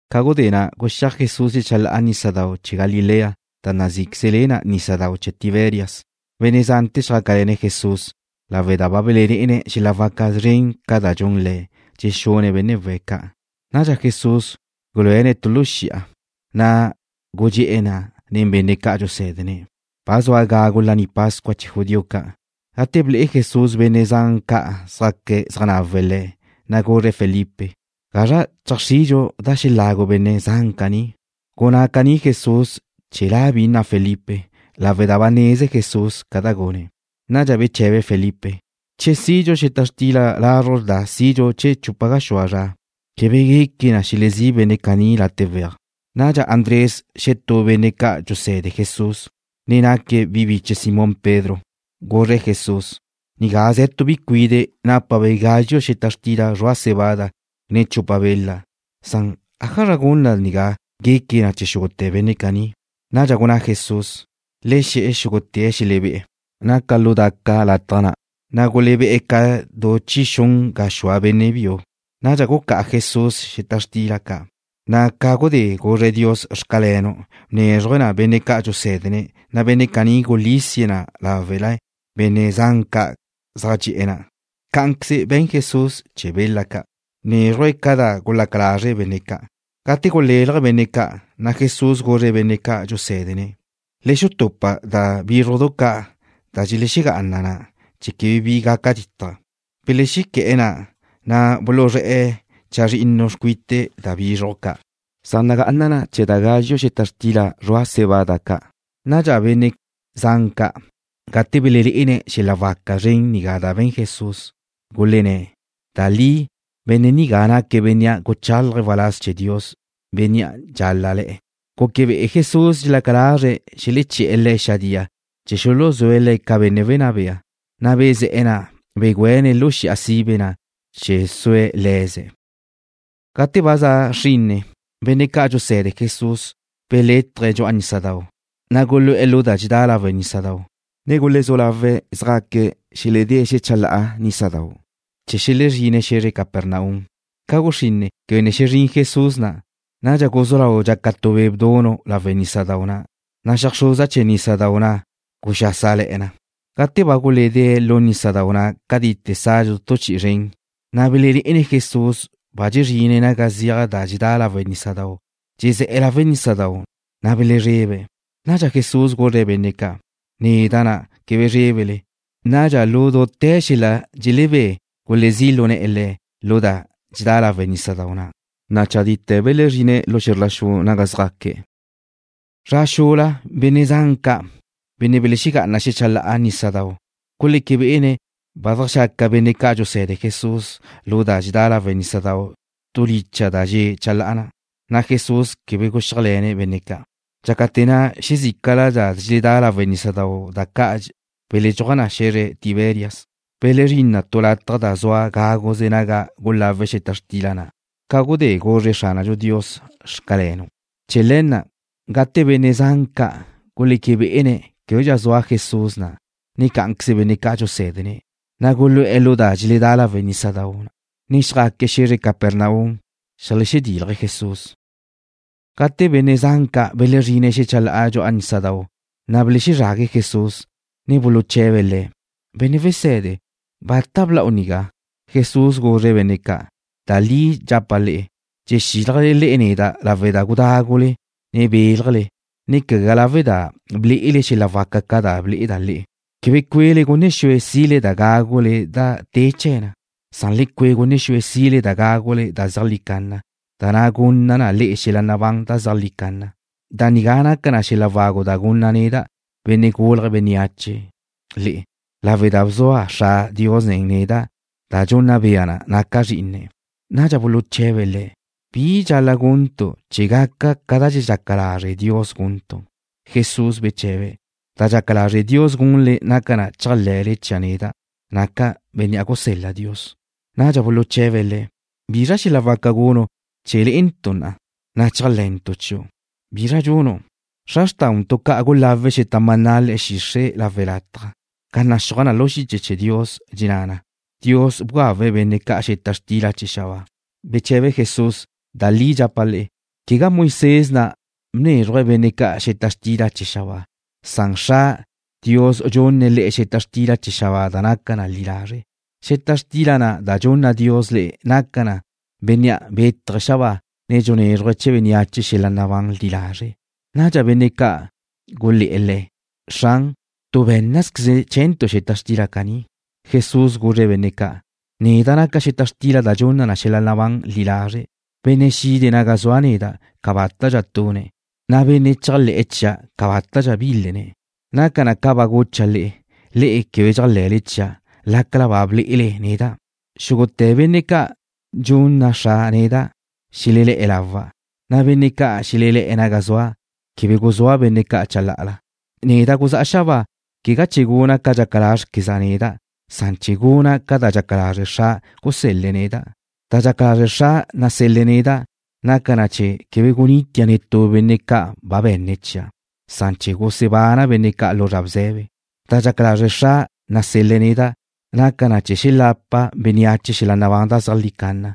Ca gudé na' guxíaj Jesús xecha la'a dxu'a nísadau' chee̱ Galilea, da nazíqueze le na nísadau' chee̱ Tiberias. Benne' zante̱ zjácale̱ne̱' Jesús lawe' da ba belelé'ene̱' xel-la' waca zren ca' da dxun Le̱', dxexune̱' benne' we̱' ca'. Nadxa Jesús guluéne̱' tu lu xi'a, na' gudxé'e̱ na' nen benne' ca' dxusé̱dene̱'. Ba zua gagu Laní Pascua chee̱ judío ca'. Gate ble'e Jesús benne' zan ca' zá'aque̱' zeaj nawe̱' Le̱', na' guzre̱' Felipe: ―¿Gazra cheajxridxu da xelagu benne' zan caní? Gunná caní Jesús chee̱ la' bi nna Felipe, lawe' da ba neze Jesús ca da gune̱'. Nadxa beche̱be Felipe: ―Che sidxu xeta xtila lazruj da sidxu chee̱ chupa gaxúa zra, quebe gueque na xelezí' benne' caní late' weaj. Nadxa Andrés, xetú benne' ca' dxuse̱de Jesús, ne naque̱' bi biche Simón Pedro, guzre̱' Jesús: ―Ze̱ tu bi cuide' nigá nápabe' gazxu' xeta xtila zrua' cebada, ne chupa bela. ¿Ájazra gun da nigá gueque na chee̱ xúgute̱ benne' caní? Nadxa gunná Jesús: ―Le xe̱ xúgute̱' xelebé'e̱. Naca lu daca lataj na', na' gulebé' ca du chi xun gaxúa benne' biu. Nadxa gucá'a Jesús xeta xtila ca', na' ca gudé guzre̱' Dios “Xcalenu'”, bnézruje̱' na benne' ca' dxusé̱dene̱', na' benne' caní gulísie̱' na láwele benne' zan ca' zaj dxe'e̱ na'. Cá'anqueze be̱n Jesús chee̱ bela ca', na' bnézruje̱' ca da gulaca lazre' benne' ca'. Gate gulélaje benne' ca', na' Jesús guzre̱' benne' ca' dxusé̱dene̱': ―Le xutupa da bízrujdu ca' da dxelexegá'ana na, chee̱ quebe bi gaca dítaje. Belexequé̱'e̱ na, na' buluzré̱'e̱ chazrinnu xcuite da bizruj ca' zaj nagá'ana na chee̱ da gazxu' xeta xtila zrua' cebada ca'. Nadxa benne' zan ca', gate belelé'ene̱' xel-la' waca zren nigá da be̱n Jesús, gulenné̱': ―Da li benne' nigá naque̱' bénnea' guchálaje̱' waláz chee̱ Dios, bénnea' dxal-la' le̱'e̱. Guque bé'ene̱' Jesús dxelaca lazre̱' xeleché̱'e̱ Le̱' xadía chee̱ xuluzúe̱' Le̱' ca benne' wenná bea, na' bezé̱'e̱ na', ne begüéne̱' lu xi'a sibe na' chee̱ sue̱' le̱ze̱'. Gate ba za xrinne, benne' ca' dxuse̱de Jesús belétaje̱' dxu'a nísadau', na' gulu'e̱ lu da dxedá lawe' nísadau', ne gulezú lawe̱' zjaque̱' xeledée̱' xechalá'a nísadau' chee̱ xelezrine̱' xe̱zre Capernaum. Ca guxrinne, quebe ne xezrín Jesús na'. Nadxa guzú lau dxaca tu be' bdunu' lawe' nísadau' na', na' xeajxruza chee̱ nísadau' na' guxásale̱'e̱ na. Gate ba guledée̱' lu nísadau' na' catite sadxu tu chi'i zren, na' belelé'ene̱' Jesús ba dxezrine̱' naga ziaj da dxedá lawe' nísadau', dxezé̱'e̱ lawe' nísadau', na' belezrebe̱'. Nadxa Jesús guzre̱' benne' ca': ―Neda' na'. Quebe zrébele. Nadxa lu dute̱ xel-la' dxelebé gulezí' lu ne̱'e̱ Le̱' lu da dxedá lawe' nísadau' na', na' chadite̱ belezrine̱' lu xe̱zr la xu naga zjaque̱'. Zra xula benne' zan ca', benne' belexegá'ana xecha la'a nísadau', guleque bé'ene̱' ba zeajxaca benne' ca' dxuse̱de Jesús lu da dxedá lawe' nísadau' tu licha' da dxe' chalá'a na', na' Jesús quebe guxíajle̱ne̱' benne' ca'. Dxácate̱ na' xezícala da dxeledá lawe' nísadau', da ca' beledxúaj na xe̱zre Tiberias, belezrín na tu lataj da zua gáguze naga gulawe̱' xeta xtila na' ca gudé guzre Xránadxu Dios: “Xcalenu'.” Chee̱ le̱ na' gate benne' zan ca' guleque bé'ene̱' québedxa zua Jesús na', ne cá'anqueze benne' ca' dxusé̱dene̱', na' gulu'e̱ lu da dxeledá lawe' nísadau', ne xjaque̱' xe̱zre Capernaum zeajlexedílaje̱' Jesús. Gate benne' zan ca' belezrine̱' xecha la'a dxu'a nísadau', na' belexezrague̱' Jesús, ne buluche̱be̱' Le̱': ―Benne' Wese̱de, ¿bata bla'u nigá? Jesús guzre̱' benne' ca': ―Da li dxapa' le'e, dxexílajle le'e neda' lawe' da gudágule, ne béljele, ne quegá lawe' da ble'ele xel-la' waca ca' da ble'eda' le'e. Quebe cue'le gunne xue sile da gágule da te chee̱ na. Le cue' gunne xue sile da gágule da zeajlí canna, da na' gunna na le'e xel-la' nabán da zeajlí canna. Da nigá naca na xel-la' wagu da gunna' neda', Benne' Gulje̱' Bénneache, le'e, lawe' da bzua Xra' Dios nen neda' da dxunna bea na naca' Zrí'ine̱'. Nadxa buluche̱be̱' Le̱': ―¿Bi dxal-la' guntu' chee̱ gaca ca da dxaca lazre' Dios guntu'? Jesús beche̱be̱': ―Da dxaca lazre' Dios gunle naca na chéajle̱le chia' neda', naca' Bénnea' gusel-la Dios. Nadxa buluche̱be̱' Le̱': ―¿Bizra xel-la' waca gunu' chee̱ le'entu' na, na' chéajle̱ntu chiu'? ¿Bizra dxunu'? Xra xrtauntu' ca' gulawe̱' xeta maná le̱'e̱ xixre' lawe' lataj, ca naxúaj na lu xiche chee̱ Dios, dxenná na: Dios bgawe̱' benne' ca' xeta xtila da za xabáa. Beche̱be Jesús: ―Da li dxapa' le'e, quegá Moisés na' bnézruje̱' benne' ca' xeta xtila da za xabáa. Dios, Xra', dxunne̱' le'e xeta xtila da za xabáa da naca na li lazre'. Xeta xtila na' da dxunna Dios le'e naca na Bénnea' bétaje̱' xabáa, ne dxunézruje̱' chee̱ bénneache xel-la' nabán li lazre'. Nadxa benne' ca' gulé̱'e̱ Le̱': ―Xran, tu bé̱nnazqueze chee̱ntu' xeta xtila caní. Jesús guzre̱' benne' ca': ―Neda' naca' xeta xtila da dxunna na xel-la' nabán li lazre'. Benne' xide̱' naga zua' neda' cabátadxa tune̱', na' benne' chéajle̱'e̱ chia' cabátadxa bílene̱'. Naca na ca ba gucha' le'e. Le'e na' quebe dxéajle̱le chia', lácala ba ble'ele neda'. Xúgute̱ benne' ca' dxunna Xra' neda', xelelé̱'e̱ lawa', na' benne' ca' xelelé̱'e̱ naga zua', quebe guzúa' benne' ca' chalá'ala. Neda' guzá'a xabáa, quegá chee̱ guna' ca dxaca lázrequeza' neda'. Bla'a chee̱ guna' ca da dxaca lazre' Xra', gusel-le̱' neda'. Da dxaca lazre' Xra', nasel-le̱' neda', naca na chee̱ quebe gunitia' netú benne' ca' ba be̱nne̱' chia'. Nacan chee̱ gusebana' benne' ca' lu zra bze̱be. Da dxaca lazre' Xra', nasel-le̱' neda', naca na chee̱ xelapa bénneache xel-la' nabán da zeajlí canna,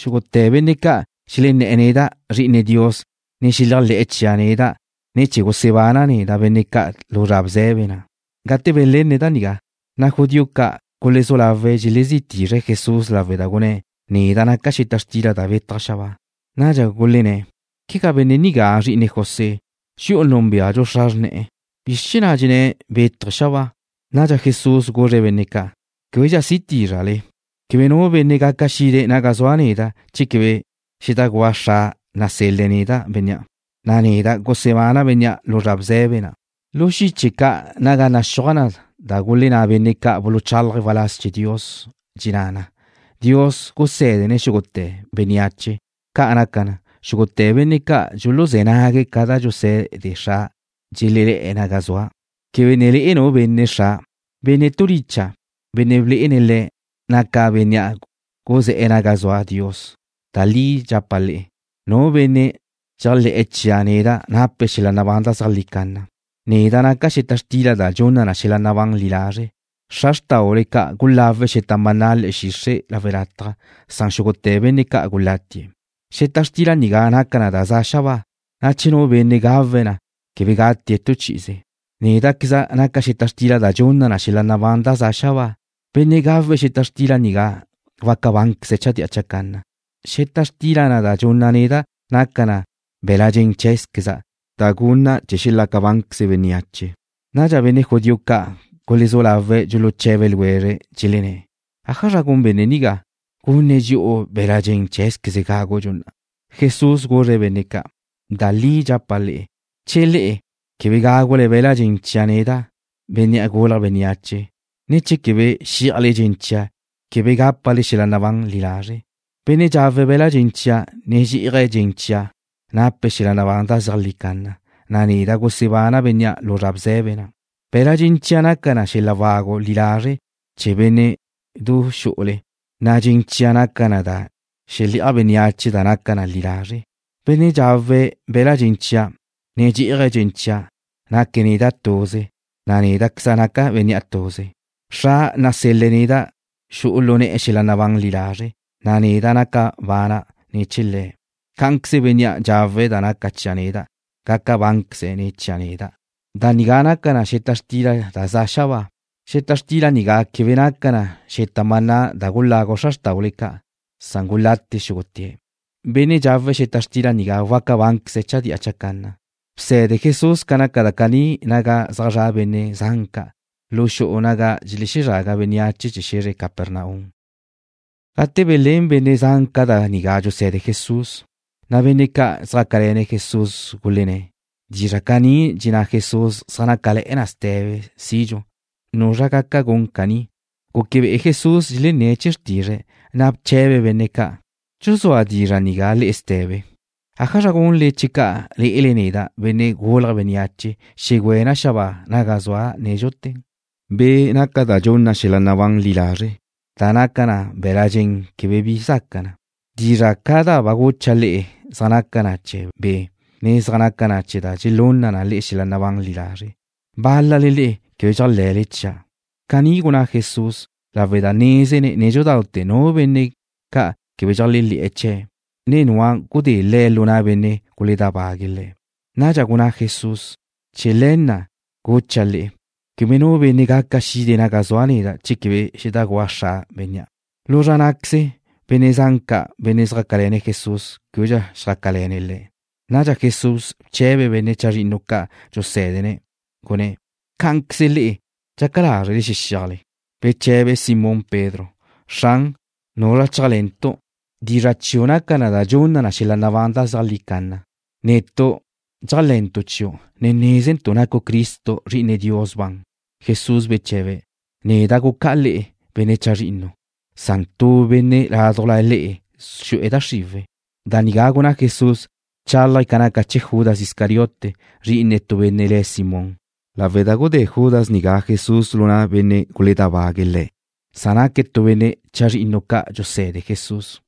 xúgute̱ benne' ca' xelenné̱'e̱ neda', Zri'ine Dios, ne xeléajle̱'e̱ chia' neda', na' chee̱ gusebana' neda' benne' ca' lu zra bze̱be na'. Gate belenne̱' da nigá, na' judío ca' gulezú lawe̱' dxelezí tizre̱' Jesús lawe' da gunné̱': “Neda' naca' xeta xtila da betaj xabáa.” Nadxa gulenné̱': ―¿Quegá benne' nigá zri'ine José? Dxi'u núnbeadxu xra xrne̱'e̱. ¿Bizr chee̱ na' dxenné̱' bétaje̱' xabáa? Nadxa Jesús guzre̱' benne' ca': ―Québedxa si tízrale. Quebe nu benne' gaca xide̱' naga zua' neda', che quebe xedajgúa Xra' nasel-le̱' neda' bénnea', na' neda' gusebana' bénnea' lu zra bze̱be na'. Lu xiche ca' naga naxúaj da gulenná benne' ca' buluchalaje̱' waláz chee̱ Dios, dxenná na: Dios gusé̱dene̱' xúgute̱ bénneache. Ca' gaca na, xúgute̱ benne' ca' dxuluzé̱ nague̱' ca da dxuse̱de Xra', dxelelé̱'e̱ naga zua'. ’Quebe ne le'e nu benne' Xra'. Benne' tu licha', bénnea' blé'ene̱' Le̱', naca bénnea' guzé̱'e̱ naga zua Dios. Da li dxapa' le'e, nu benne' dxéajle̱'e̱ chia' neda' nape̱' xel-la' nabán da zeajlí canna. Neda' naca' xeta xtila da dxunna na xel-la' nabán li lazre'. Xra xrtáule ca' gulawe̱' xeta maná le̱'e̱ xixre' lawe' lataj, na' gudé na' xúgute̱ benne' ca' gulatie̱'. Xeta xtila nigá naca na da za xabáa, na' che nu benne' gawe̱' na, quebe gatie̱' tu chi'ize. Néda'queza' naca' xeta xtila da dxunna na xel-la' nabán da za xabáa. Benne' gawe̱' xeta xtila nigá waca bánqueze̱' chadía chacanna. Xeta xtila na' da dxunna' neda' naca na be̱la' dxen cheé̱zqueza', da gunna' chee̱ xelaca bánqueze bénneache. Nadxa benne' judío ca' gulezú lawe̱' dxuluche̱be ljwezre̱', dxelenné̱': ―¿Ájazra gun benne' nigá, gunne̱' dxi'u be̱la' dxen cheé̱zqueze̱' chee̱ gágudxu na? Jesús guzre̱' benne' ca': ―Da li dxapa' le'e, che le'e quebe gágule be̱la' dxen chia' neda', Benne' Gulje̱' Bénneache, ne che quebe xí'ajle dxen chia', quebe gápale xel-la' nabán li lazre'. Benne' dxawe̱' be̱la' dxen chia', ne dxí'aje̱' dxen chia' nape̱' xel-la' nabán da zeajlí canna, na' neda' gusebana' bénnea' lu zra bze̱be na'. Be̱la' dxen chia' naca na xel-la' wagu li lazre' chee̱ bénne'du xu'ule, na' dxen chia' naca na da xele'aj bénneache da naca na li lazre'. Benne' dxawe̱' be̱la' dxen chia', ne dxí'aje̱' dxen chia', naque̱' neda' tuze, na' néda'queza' naca' bénnea' tuze. Xra' nasel-le̱' neda' xu'u lu ne̱'e̱ xel-la' nabán li lazre', na' neda' naca bana' ne̱ chee̱ Le̱'. Cá'anqueze bénnea' dxawe̱' da naca chia' neda' gaca bánqueze̱' ne̱ chia' neda'. Da nigá naca na xeta xtila da za xabáa. Xeta xtila nigá quebe naca na ca xeta maná da gulagu xra xrtáule ca', na' gudé na' gulate xúgute̱'. Benne' dxawe̱' xeta xtila nigá waca bánqueze̱' chadía chacanna. Bse̱de Jesús ca naca da caní naga zaj zra' benne' zan ca' lu xu'u naga dxelezraga bénneache chee̱ xe̱zre Capernaum. Gate belén benne' zan ca' da nigá dxuse̱de Jesús, na' benne' ca' zjácale̱ Jesús gulenné̱': ―Dizra' caní dxenná Jesús zaj nácale̱'e̱ na ste̱be sidxu. ¿Nuzra gaca gun caní? Guque bé'ene̱' Jesús dxelenné̱' chee̱ xrtizre̱', na' bche̱be̱' benne' ca': ―¿Dxuzúa dizra' nigá le'e ste̱be? ¿Ájazra gunle checa' lé'ele neda', Benne' Gulje̱' Bénneache, xegüéna' xabáa naga zua' nédxute̱? Be' naca na da dxunna xel-la' nabán li lazre'. Da naca na be̱la' dxen quebe bi zaca na. Dizra' ca' da ba gucha' le'e zaj naca na chee̱ Be', ne zaj naca na da dxelunna na xel-la' nabán li lazre'. Bál-lale le'e quebe dxéajle̱le chia'. Caní gunná Jesús lawe' da nézene̱' nédxudaute̱ nu benne' ca' quebe dxeléajle̱'e̱ chee̱', ne nua' gudé Le̱' lu na' benne' guledábague̱' Le̱'. Nadxa gunná Jesús: ―Chee̱ le̱ na' gucha' le'e, quebe nu benne' gaca xide̱' naga zua' neda' che quebe xedajgúa Xra' bénnea'. Lu zra ná'queze benne' zan ca', benne' xjácale̱ne̱' Jesús, québedxa xjácale̱ne̱' Le̱'. Nadxa Jesús bche̱be̱' benne' chazrinnu ca' dxusé̱dene̱', gunné̱': ―¿Cá'anqueze le'e dxaca lázrele xexíajle? Beche̱be Simón Pedro: ―Xran, ¿nuzra chéajle̱ntu'? Dizra' chiu' naca na da dxunna na xel-la' nabán da zeajlí canna. Netu' dxéajle̱ntu' chiu', ne nézentu' nacu' Cristo, Zri'ine Dios ban. Jesús beche̱be̱': ―Neda' gucá'a le'e, benne' chazrinnu, na' tu benne' ládujla le'e xu'e̱ da xriwe̱'. Da nigá gunná Jesús, bchálaje̱' ca naca chee̱ Judas Iscariote, zri'ine tu benne' le̱' Simón, lawe' da gudé Judas nigá Jesús lu na' benne' guledábague̱' Le̱'. Naque̱' tu benne' chazrinnu ca' dxuse̱de Jesús.